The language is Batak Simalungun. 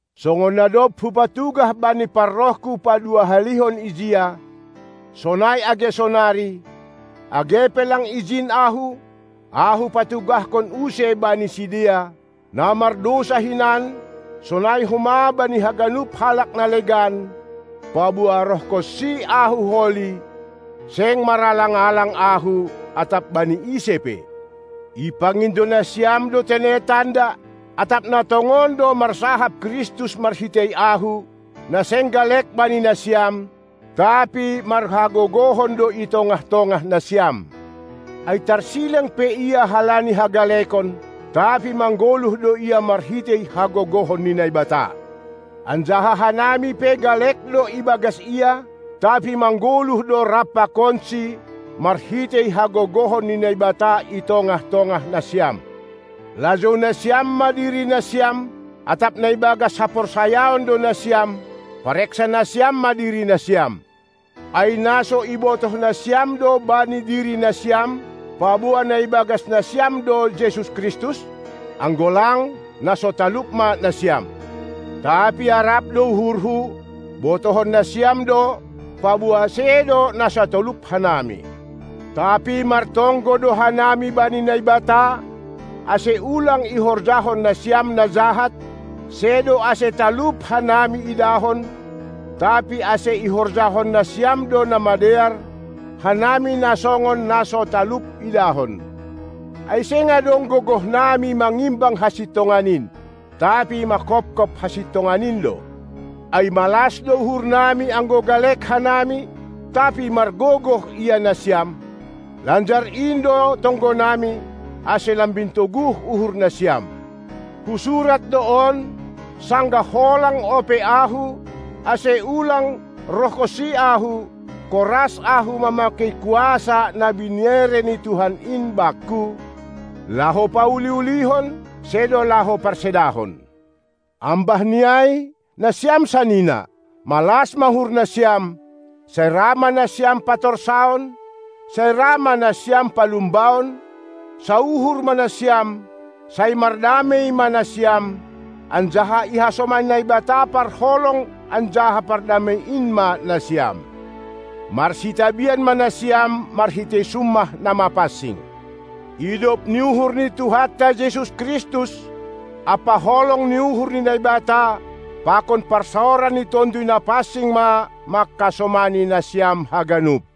Songon na dob hupatugah bani parrohku paduahalihon ijia, sonai age sonari, age pe lang ijin ahu, ahu patugahkon use bani sidea, na mardousa hinan, sonai homa bani haganup halak na legan, paboa roh honsi ahu holi, seng maralang-alang ahu atap bani ise pe. Ipangindo nasiam do tene tanda, atap na tongon do marsahap Kristus marhitei ahu, na seng galek bani nasiam, tapi marhagogohon do i tongah-tongah nasiam. Ai tarsilang pe Ia halani hagalekon, tapi manggoluh do Ia marhitei hagogohon ni Naibata. Anjaha hanami pe galek do ibagas Ia, tapi manggoluh do rap pakonsi marhitei hagogohon ni Naibata i tongah-tongah nasiam. Lajou nasiam ma diri nasiam, atap na ibagas haporsayaon do nasiam, pareksa nasiam ma diri nasiam. Ai na so ibotoh nasiam do bani diri nasiam, paboa na ibagas nasiam do Jesus Kristus? Anggo lang, na so talup ma nasiam. Tapi arap do uhurhu, botohon nasiam do, paboa sedo na so talup hanami. Tapi martonggo do hanami bani Naibata, ase ulang ihorjahon nasiam na jahat, sedo ase talup hanami idahon, tapi ase ihorjahon nasiam do na madear, hanami na songon na so talup idahon. Ai seng adong gogohnami mangimbang hasintongan in, tapi manghophop hasintongan in do. Ai malas do uhurnami anggo galek hanami, tapi margogoh ia nasiam. Lanjar in do tonggonami, ase lambin toguh uhur nasiam. Husurat do on, sanggah holang ope ahu, ase ulang roh honsi ahu, koras ahu mamakei kuasa na binere ni Tuhan in bakku. laho pauli-ulihon, sedo laho parsedahon. Ambah ni ai, nasiam sanina, malas ma uhur nasiam, sai ra ma nasiam patorsaon, sai ra ma nasiam palumbaon, sauhur ma nasiam, sai mardamei ma nasiam, anjaha ihasomani Naibata parholong anjaha pardamei in ma nasiam. Marsitabian ma nasiam marhitei summah na mapansing. Idop ni uhur ni Tuhanta Jesus Kristus ampa holong ni uhur ni Naibata pakon parsaoran ni Tonduy Napansing ma manghasomani nasiam haganup!